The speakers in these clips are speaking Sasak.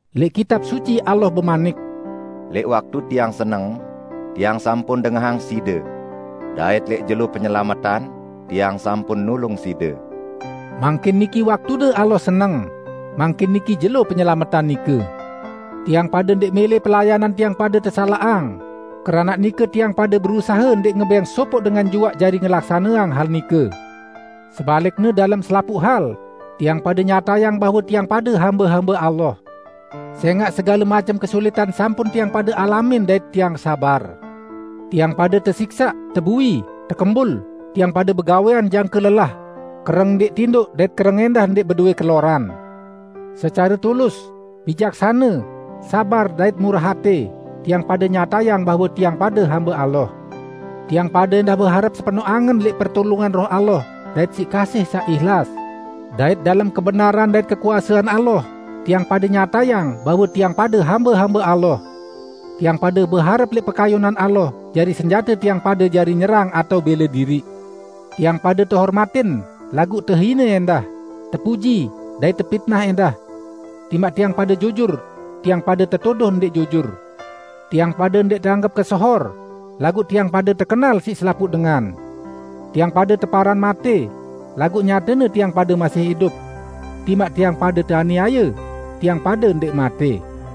Lẽq Kitab Suci, Allah bemanik, "Lẽq waktu Tiang seneng, Tiang sampun dengahang side, dait lẽq jelo penyelametan, Tiang sampun nulung side." Mangkin niki waktune Allah seneng, mangkin niki jelo penyelametan nike! Tiang pade ndẽq mẽlẽ pelayanan tiang pade tesalaqang, keranaq nike tiang pade berusahe ndẽq ngebẽng ndẽq ngebẽng sopoq dengan juaq jari ngelaksaneang hal nike. Sebalikne, dalem selapuq hal, tiang pade nyatayang bahwe tiang pade hambe-hambe Allah. Sẽngaq, segale macem kesulitan sampun tiang pade alamin dait tiang sabar: Tiang pade tesiksaq, tebui, tekembul; tiang pade begawẽan Jangke lelah, kereng ndẽq tindoq dait kereng ẽndah ndẽq bedowẽ keloran. Secare tulus, bijaksane, sabar dait murah atẽ, tiang pade nyatayang bahwe tiang pade hambe Allah. Tiang pade ẽndah beharep sepenoq angen lẽq pertulungan Roh Allah, dait siq kasih saq ihlas, dait dalem kebenaran dait kekuasean Allah, tiang pade nyatayang bahwe tiang pade hambe-hambe Allah. Tiang pade beharep lẽq pekayunan Allah jari senjate tiang pade jari nyerang atao bẽle diriq. Tiang pade tehormatin, laguq tehine ẽndah; tepuji, dait tepitnah ẽndah. Timaq tiang pade jujur, tiang pade tetuduh ndẽq jujur. Tiang pade ndẽq teanggep kesohor, laguq tiang pade tekenal siq selapuq dengan. Tiang pade teparan matẽ, laguq nyatene tiang pade masih idup. Timaq tiang pade teaniaye, tiang pade ndẽq matẽ.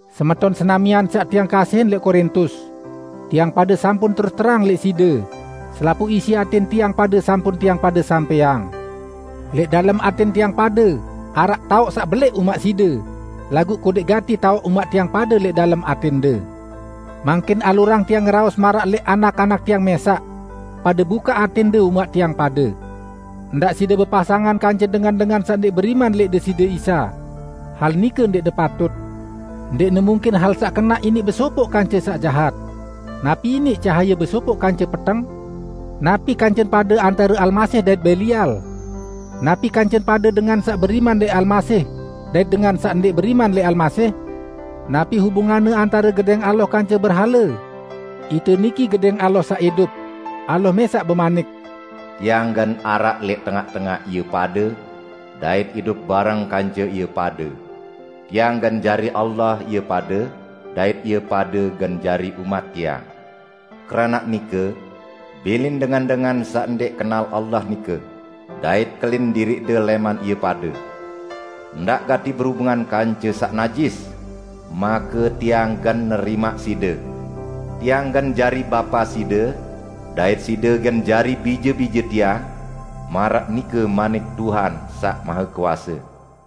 Semeton senamian saq tiang kasihin lẽq Korintus! Tiang pade sampun terus-terang lẽq side. Selapuq isi atẽn tiang pade sampun tiang pade sampẽang. Lẽq dalem atẽn tiang pade, araq taoq saq belẽq umaq side, laguq kodẽq gati taoq umaq tiang pade lẽq dalem atẽnde. Mangkin, alurang tiang ngeraos maraq lẽq anak-anak tiang mẽsaq. Pade bukaq atẽnde umaq tiang pade. Ndaq side bepasangan kance dengan-dengan saq ndẽq beriman lẽq Deside Isa; hal nike ndẽqne paut. Ndẽqne mungkin hal saq kenaq iniq besopoq kance saq jahat! Napi iniq cahaye besopoq kance peteng? Napi kancen pade antare Almasih dait Belial? Napi kancen pade dengan saq beriman lẽq Almasih dait dengan saq ndẽq beriman lẽq Almasih? Napi hubunganne antare gedẽng Allah kance berhale? Ite niki gedẽng Allah saq idup. Allah mẽsaq bemanik, "Tiang gen araq lẽq tengaq-tengaq ie pade, dait idup bareng kance ie pade. Tiang gen jari Allah ie pade, dait ie pade gen jari umat Tiang. Keranaq nike, bilin dengan-dengan saq ndẽq kenal Allah nike, dait kelin diriqde lẽman ie pade. Ndaq gati berubungan kance saq najis, make Tiang gen nerimaq side. Tiang gen jari Bapa side, dait side gen jari bije-bije Tiang, maraq nike manik Tuhan Saq Mahekuase."